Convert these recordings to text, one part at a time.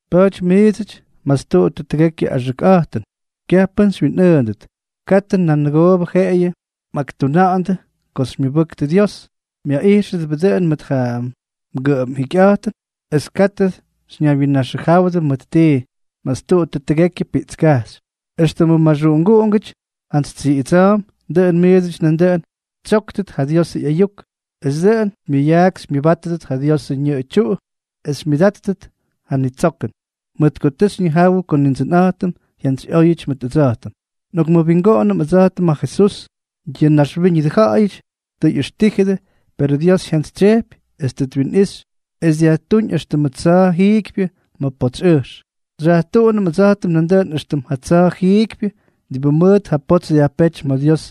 Pa̱a̱ty miidsʉty, mastuꞌuttʉ tʉgekyʉ axʉkꞌa̱jtʉn. Kyaj pʉ́n xywyinꞌʉʉndʉt. Katʉ nan nʉgoobʉ jeꞌeyʉ mꞌakjʉna̱ꞌa̱ndʉ ko xymyʉbʉktʉ Dios, myaꞌíxʉdʉbʉ dʉꞌʉn mʉt ja mgʉꞌʉm jikyꞌa̱jtʉn, es katʉ xyñaywyinnaxʉjáwʉdʉ mʉt tii. Mastuꞌuttʉ tʉgekyʉ piꞌtskajxy. Extʉmʉ maxuꞌunguꞌungʉty jantsy tsiꞌidsa̱a̱mp, dʉꞌʉn miidsʉty nandʉꞌʉn xytsyóktʉt ja Diosʉ ꞌyayuk, es dʉꞌʉn xymyʉyaak xymyʉbátʉt ja Diosʉ ñʉꞌʉ tyuꞌu es xymyʉdátʉt ja nitsokʉn, mʉt ko tʉ xyñijáwʉdʉ ko Nindsʉnꞌa̱jtʉm jyantsyꞌóyʉty mʉt ʉdsa̱jtʉm. Nꞌokmʉwingoꞌonʉm ʉdsa̱jtʉm ja Jesús. Yʉ naxwíñʉdʉ ja̱ꞌa̱yʉty tʉ ꞌyʉxtíjʉdʉ, perʉ Dios jyantsytsyejpy es tʉ twinꞌixy, es dyajtúñ éxtʉmʉ tsa̱a̱ jiikypyʉ ma̱ potsy ʉjx. Xyajtuꞌunʉm ʉdsa̱jtʉm nandʉꞌʉn éxtʉm ja tsa̱a̱ jiikypyʉ, diꞌibʉ mʉʉt ja potsy dyajpéty ma̱ Dios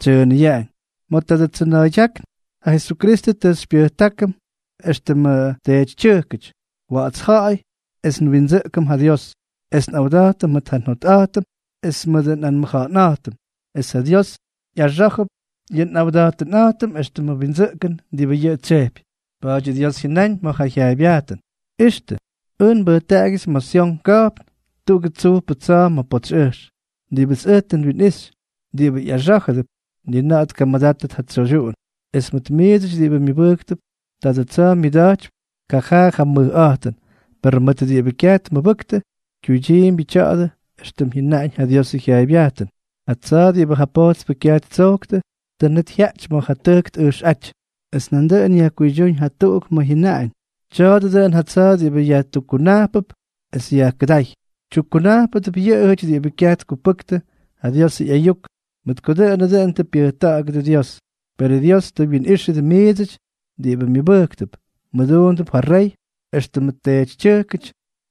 tsyʉʉnʉyaꞌañ. Ma̱ tadʉ tsʉna̱a̱ydyákn, ja Jesukristʉ tʉ xypyʉjtákʉm éxtʉmʉ teetytyʉjkʉty, wa̱ꞌa̱ts ja̱ꞌa̱y, es nwindsʉꞌkʉm ja Dios, es nꞌawda̱jtʉm mʉt ja njotꞌa̱jtʉm es mʉdʉ nꞌanmʉja̱ꞌa̱nꞌa̱jtʉm, es ja Dios ꞌyaxá̱jʉp yʉ nꞌawda̱jtʉnꞌa̱jtʉm éxtʉmʉ windsʉꞌkʉn diꞌibʉ yʉꞌʉ tsyejpy. Pa̱a̱dyʉ Dios jyʉnáñ ma̱ ja jyaaybyajtʉn: ¡Ixtʉ! Ʉj nbʉjtaꞌagyʉts ma̱ Syon ka̱jpn tuꞌugʉ tsujpʉ tsa̱a̱ ma̱ potsy ʉjx, diꞌibʉts ʉj tʉ nwinꞌixy. Diꞌibʉ ꞌyaxá̱jʉdʉp, ni na̱ꞌa̱ tkamʉdátʉt ja tsoydyuꞌun. Es mʉt miidsʉty diꞌibʉ myʉbʉjktʉp, tadʉ tsa̱a̱ myʉda̱jtypy kajaa yʉ mʉjꞌa̱jtʉn; per mʉt diꞌibʉ kyaj tmʉbʉktʉ, kyuydyiimbyʉ tya̱a̱dʉ éxtʉm jyʉnaꞌañ ja Diosʉ jyaaybyajtʉn: Ja tsa̱a̱ diꞌibʉ ja pojtspʉ kyaj ttsojktʉ, tʉ net jyaꞌty ma̱ ja tʉjk tꞌʉjxꞌáty. Es nandʉꞌʉn yajkuydyúñ jatuꞌuk ma̱ jyʉnaꞌañ: Tya̱a̱dʉ dʉꞌʉn ja tsa̱a̱ diꞌibʉ yajtukkunajpʉp es yajkʉdáy. Tyukkunajpʉdʉp yʉꞌʉjʉty diꞌibʉ kyaj tkupʉktʉ ja Diosʉ ꞌyayuk, mʉt ko dʉꞌʉnʉ dʉn tʉ pyʉjta̱ꞌa̱gʉdʉ Dios. Perʉ Dios tʉ mwinꞌíxʉdʉ miidsʉty diꞌibʉ myʉbʉjktʉp, mmʉduundʉp ja Rey éxtʉmʉ teetytyʉjkʉty,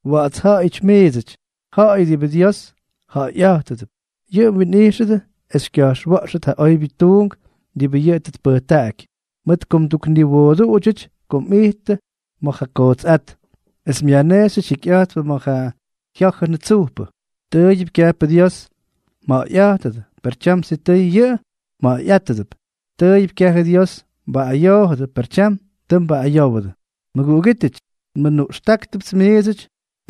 wa̱ꞌa̱ts ja̱ꞌa̱yʉty miidsʉty, ja̱ꞌa̱y diꞌibʉ Dios ja̱ꞌa̱yꞌa̱jtʉdʉp. Yʉꞌʉ mwinꞌijxʉdʉ es xykya̱jxwa̱ꞌxʉt ja oybyʉ tuunk diꞌibʉ yʉꞌʉ tʉ tpʉjtaꞌaky, mʉt ko mdukniwooduꞌudyʉty ko mꞌijttʉ ma̱ ja kootsꞌát, es myajnejxyʉty jikyꞌa̱jtpʉ ma̱ ja jyá̱jʉnʉ tsujpʉ. Tʉʉyʉp kyajpʉ Dios mja̱ꞌa̱yꞌátʉdʉ, per tyam sitʉy yʉꞌʉ mja̱ꞌa̱yꞌa̱jtʉdʉp; tʉʉyʉp kyajʉ Dios mbaꞌꞌayoojʉdʉ, per tyam tʉ mbaꞌꞌayówʉdʉ. Mʉguꞌugítʉty, nmʉnuꞌxtáktʉpts miidsʉty,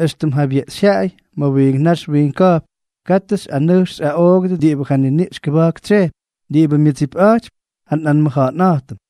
éxtʉm jabyeꞌxyjyaꞌay ma̱ wiink nax wiink ka̱jpn, katʉ xyꞌanʉjx xyꞌaꞌoogʉdʉ diꞌibʉ ja niniꞌx kʉba̱jk tsyejpy, diꞌibʉ myʉdsipꞌa̱jtypy ja nꞌanmʉja̱ꞌa̱nꞌa̱jtʉm.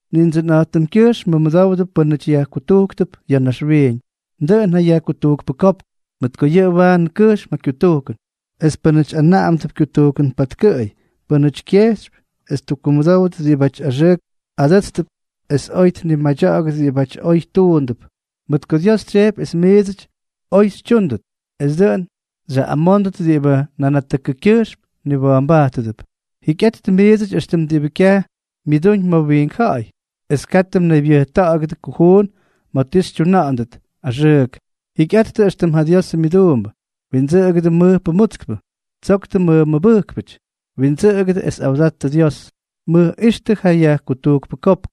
Nindsʉnꞌa̱jtʉmgyʉjxm mʉmʉdowdʉ pʉ́nʉty yajkutujkp ya̱ naxwiiñ, dʉꞌʉn ja yajkutujkpʉkópk, mʉt ko yʉꞌʉ waanʉ kʉjxm ja kyutujkʉn, es pʉ́nʉty anaꞌamdʉp kyutujkʉn patkʉꞌʉy, pʉ́nʉty kyejxypy es ttukkumʉdówʉt diꞌibáty axʉʉk adʉ́tstʉp es oy tnimadya̱ꞌa̱gʉt diꞌibáty oy tuundʉp. Mʉt ko Dios tsyejpy es miidsʉty oy xytyúndʉt, es dʉꞌʉn xyaꞌꞌamóndʉt diꞌibʉ nanatʉkʉkyʉjxm mniwa̱a̱mbajtʉdʉp. Jikyꞌattʉ miidsʉty éxtʉmʉ diꞌibʉ kyaj myʉdúñ ma̱ wiink ja̱ꞌa̱y, es katʉ mnaybyʉjta̱ꞌa̱gʉdʉ kujuun ma̱ ti xytyuna̱ꞌa̱ndʉt axʉʉk. Jikyꞌattʉ éxtʉm ja Diosʉ myʉduumbʉ. Windsʉꞌʉgʉdʉ mʉjpʉ mutskpʉ. Tsoktʉ mmʉmʉbʉjkpʉty. Windsʉꞌʉgʉdʉ es awdattʉ Dios. Mʉjꞌíxtʉ ja yajkutujkpʉ kopk.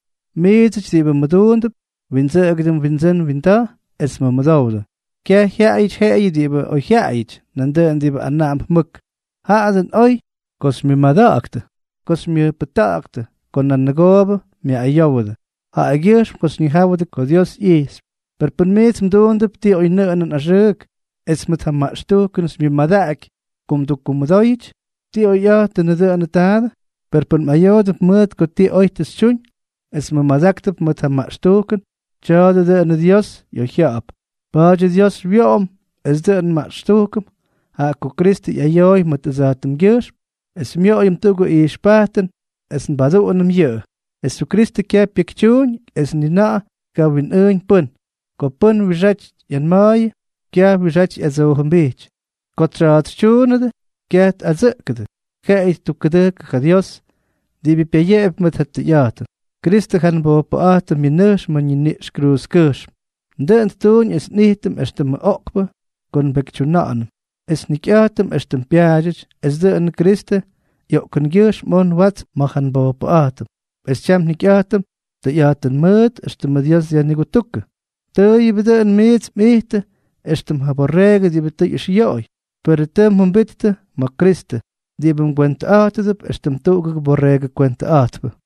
Miidsʉty diꞌibʉ mʉduundʉp, windsʉꞌʉgʉdʉ mwindsʉ́n mwinda̱j es mʉmʉdowdʉ, kyaj jyaꞌayʉty jeꞌeyʉ diꞌibʉ oyjyaꞌayʉty, nandʉꞌʉn diꞌibʉ anaꞌamp mʉk. Jaꞌa dʉꞌʉn oy ko xymyʉmada̱ꞌa̱ktʉ ko nanʉgoobʉ myaꞌꞌayówʉdʉ, jaꞌagyʉjxm ko xyñijáwʉdʉ ko Dios ꞌyijxypy. Per pʉn miits mduundʉp ti oynʉꞌʉnʉn axʉʉk, es mʉt ja maꞌxtujkʉn xymyʉmadaꞌaky ko mdukkumʉdóyʉty, ¿ti oyꞌa̱jtʉnʉ dʉnʉ taadʉ? Per pʉn mꞌayoodʉp mʉt ko ti oy tʉ xytyuñ, es mmʉmadáktʉp mʉt ja maꞌxtujkʉn, tya̱a̱dʉ dʉꞌʉnʉ Dios ꞌyoyjya̱ꞌa̱p. Pa̱a̱dyʉ Dios xywyoꞌom es dʉꞌʉn nmaꞌxtujkʉm, jaꞌa ko Kristʉ ꞌyayooy mʉt ʉdsa̱jtʉmgyʉjxm, es xymyoꞌoyʉm tuꞌugʉ ijxpajtʉn es nbaduꞌunʉm yʉꞌʉ. Jesukristʉ kyaj pyekytyuuñ es ni na̱ꞌa̱ tkawinꞌʉꞌʉñ pʉ́n. Ko pʉ́n wiꞌixáty ꞌyanma̱a̱yʉ, kyaj wiꞌixáty ꞌyadsoojʉmbijty; ko tsyaatsytyuunʉdʉ, kyaj tꞌadsʉꞌkʉdʉ, jeꞌeyʉ ttukkʉdʉjkʉ ja Dios, diꞌibʉ pyayeꞌepy mʉt ja tʉyꞌa̱jtʉn. Kristʉ ja nbojpʉꞌa̱jtʉm myʉnʉjx ma̱ ñiniꞌx kruuzkʉjxm. Dʉꞌʉn ttuuñ es nꞌijtʉm éxtʉmʉ oꞌkpʉ ko nbekytyuna̱ꞌa̱nʉm es njikyꞌa̱jtʉm éxtʉm pyaadyʉty, es dʉꞌʉnʉ Kristʉ ꞌyoꞌkʉngyʉjxm oj nwátsʉm ma̱ ja nbojpʉꞌa̱jtʉm, es tyam njikyꞌa̱jtʉm tʉyꞌa̱jtʉn mʉʉt, éxtʉmʉ Dios dyajnigutúkʉ. Tʉʉyʉp dʉꞌʉn miits mꞌijttʉ éxtʉm ja borreegʉ diꞌibʉ tʉ ꞌyʉxyoꞌoy, perʉ tʉ mjʉmbittʉ ma̱ Kristʉ, diꞌibʉ mgwentʉꞌa̱jtʉdʉp éxtʉm tuꞌugʉ borreegʉ kwentʉꞌa̱jtpʉ.